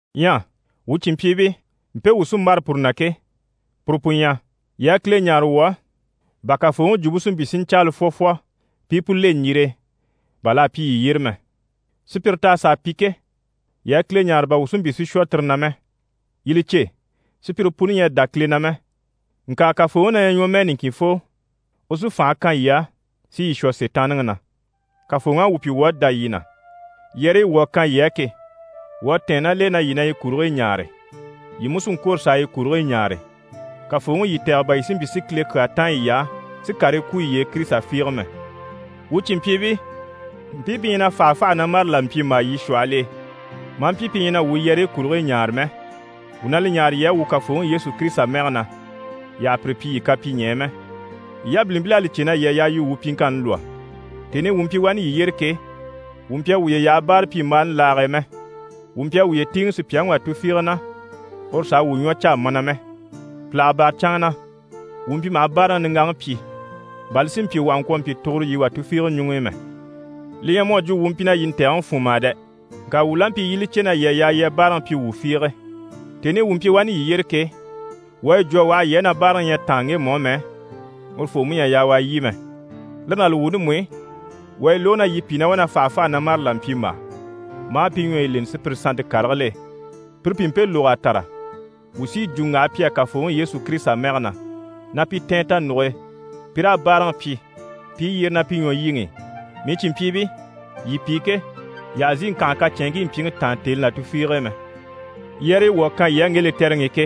Ɲyɛ wuu cìnmpyiibii, mpe mii sí n‑bâra puru na ke, puru pu ɲyɛ: yii a Kile ɲáare wuu á, bà Kafooŋi Jwumpe si mpyi si ɲcaala fwɔfwɔ, pi i pu le ɲjire e, bà l'à pyi yii yyére mɛ. Sùpyire t'à sàa pi ke, yii a Kile ɲáare bà wuu si mpyi si shwɔ tire na mɛ. Yii li cè, sùpyire puni ɲyɛ a dá Kile na mɛ. Ŋka Kafooŋi na ɲyɛ ɲwɔmɛɛ niŋkinfoo, u sí fànhe kan yii á, si yii shwɔ Sitaanniŋi na. Kafooŋi à wuu pyi wuu à dá yii na, yɛrɛyi wuu à kan yii á ke, wuu à tɛ̀ɛn ná l'e na yii na yi kurigii ɲaare, yii mú sí n‑kwôro s'a yi kurigii ɲaare. Kafooŋi u yii tɛ̀gɛ bà yii si mpyi si Kile kyaa táan yiy'á, si karii kwú yiye e Kirisita fiige mɛ. Wuu cìnmpyiibii, mpii pi ɲyɛ na fàhafaha na mâre là mpyimbaa yii shwɔhɔl'e, maa mpyi pi ɲyɛ na wuu yɛrɛyi kurigii ɲaare mɛ, wuu na li ɲáare yii á, wuu Kafooŋi Yesu Kirisita mɛge na, yii àha pire pyi yii kapyiɲɛɛ mɛ. Yii yabilimpil'à li cè na yii à yaa yii wuu pyiŋkanni lwɔ́. Tèni i wuu mpyi wani yii yyére ke, wuu mpyi a wuye yaha báarapyimbaani laage e mɛ. Wuu mpyi a wuye tíiŋɛ sùpyaŋi wà tufiige na uru s'a wuu ɲwɔ caa mana mɛ. Pìlaga bâra canŋa na, wuu mpyi maha báaraŋi niŋgaŋi pyi, bà li si mpyi wuu àha ŋkwɔ̀ mpyi tuguro yii wà tufiige ɲuŋ'i mɛ. Li ɲyɛ mu à jwo wuu mpyi na yii ntɛ̀gɛŋi fún mà dɛ! Ŋka wuu la mpyi yii i li cè na yii à yaa yii a báaraŋi pyi wuu fiige. Tèni i wuu mpyi wani yii yyére ke, wuu à yi jwo a waha yii á na báaraŋi ɲyɛ a táan ŋgemu á mɛ, urufoo mú ɲyɛ a yaa u a lyî mɛ. Lire ná li wuuni mú i, wuu à yi lógo na yii pìi na wá na fàhafaha na mâre là mpyimbaa, maa pi ɲwɔyi leni sùpyire sannte karigil'e. Pire pi mpe lóg'a tàra, wuu sí yi jwo n‑waha pi á Kafooŋi Yesu Kirisita mɛge na, na pi tɛ̀ɛn tanuge e, pi raa báaraŋi pyi, pi i yyére ná pi ɲwɔlyiŋi i. Mii cìnmpyiibii, yii pi ke, yii àha zìi ŋkànha kacɛnŋkii mpyiŋi taan tèni là tufiige e mɛ. Yɛrɛyi wuu à kan yii á ŋge lɛtɛrɛŋi i ke,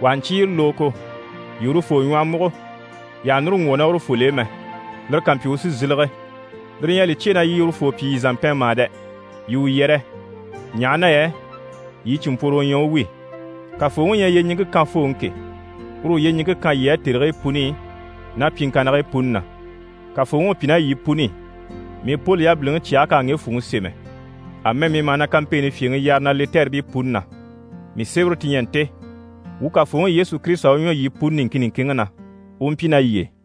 wà ha ɲcyé yi lógogo, yii urufoo ɲwɔhɔ múgo, yii àha núru ŋgwɔ̀ ná urufol'e mɛ. Lire ká mpyi, u sí n‑sílege. Lire ɲyɛ a li cyêe na yii urufoo pyi yii zàmpɛn mà dɛ! Yii u yɛrɛ, ɲaha na yɛ yii cìnmpworo u ɲyɛ u wi. Kafooŋi u ɲyɛ yyeɲiŋke kanfooŋi ke, uru u yyeɲiŋke kan yii á tèrigii puni ná pyiŋkannigii puni na. Kafooŋi u pyi ná yii puni i. Mii Poli yabiliŋi cyɛge k'à ŋge fwùŋi sémɛ. Amɛ mii maha na kampeeni fyèŋi yare na lɛtɛribii puni na. Mii sémɛre ti ɲyɛ nte. Wuu Kafooŋi Yesu Kirisita u ɲwɔ yii puni niŋkin niŋkinŋi na, u u mpyi ná yii e.